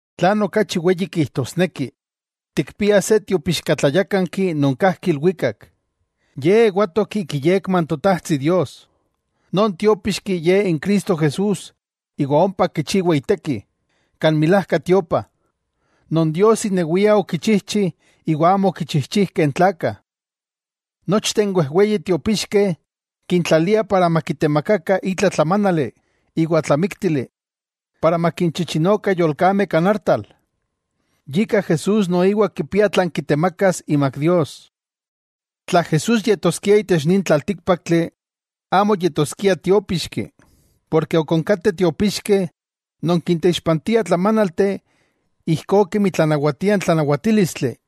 Tlan okachi weyi kijtosneki, tikpiah se tiopixkatlayákanki non kajki ilwikak, Ye ewatok ik iyekma n Totajtsi Dios, Non Tiópixki Ye n Cristo Jesús iwa ompa kichiwa iteki, kan milajka tiopa, non Dios inewia okichijchi iwa amo okichijchijkeh n tlakah. Nochteh n wejweyi tiopixkeh kintlaliah para makitemakakah itla tlamánali iwa tlamíktili para makinchichinokah yolkameh kan artal, yika Jesús noiwa kipia tlan kitemakas imak Dios. Tla Jesús yetoskia itech nin tlaltíkpaktli, amo yetoskia tiópixki, porke ok onkateh tiopixkeh non kinteixpantiah tlamánalteh ijkó kemi tlanawatia n tlanawatílistli.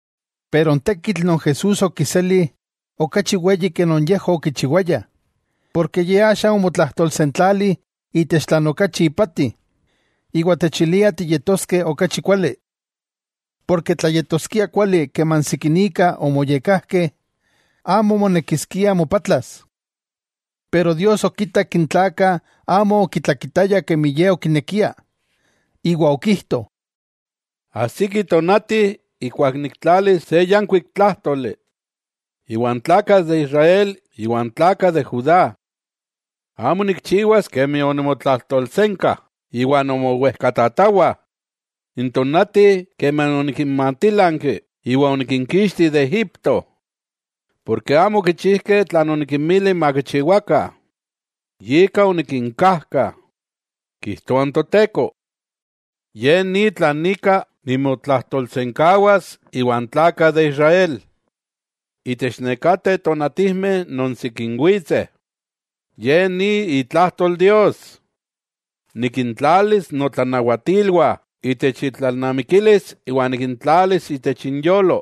Pero n tekitl non Jesús okiseli okachi weyi ke non yejwah okichiwayah, porke Ye axa omotlajtolsentlali itech tlan okachi ipati, iwa techilia tiyetoskeh okachi kuali. Porke tla yetoskia kuali keman sikinika omoyekkajkeh, amo monekiskia mopatlas. Pero Dios okitak n tlakah amo okitlakitayah kemi Ye okinekia, iwa okijto: Ajsiki tonati ijkuak niktlalis se yankuik tlájtoli iwan tlakah de Israel iwan tlakah de Judá. Amo nikchiwas kemi onimotlajtolsenka iwa nomowejkatatawah, n tonati keman onikinmatilanki iwa onikinkixti de Egipto, porke amo okichijkeh tlan onikinmili makichiwakah, yika onikinkajka, kijtoa n Toteko. Ye ni tlan ika nimotlajtolsenkawas iwan tlakah de Israel itech nekateh tonatijmeh non sikin witseh, ye ni itlajtol Dios: Nikintlalis notlanawatilwah itech intlalnamikilis iwa nikintlalis itech inyolo,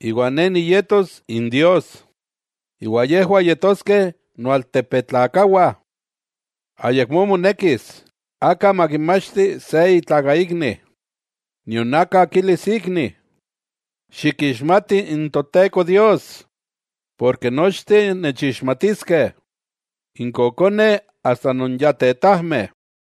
iwa Ne niyetos in Dios iwa yejwah yetoskeh noaltepetlakawah. Ayakmó monekis aka makimachti se itlakaikni, nion aka kilis ikni: —Xikixmati n Toteko Dios—, porke nochteh nechixmatiskeh, n kokoneh asta non ya tetajmeh.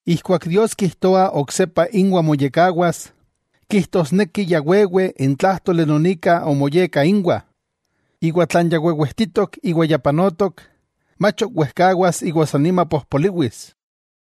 Ijkuak Dios kijtoa oksepa inwah nimoyekkawas, kijtosneki ya wewe n tlájtoli non ika omoyekka inwah, iwa tlan ya wewejtitok iwa ya panotok, mach ok wejkawas iwa sannima pojpoliwis.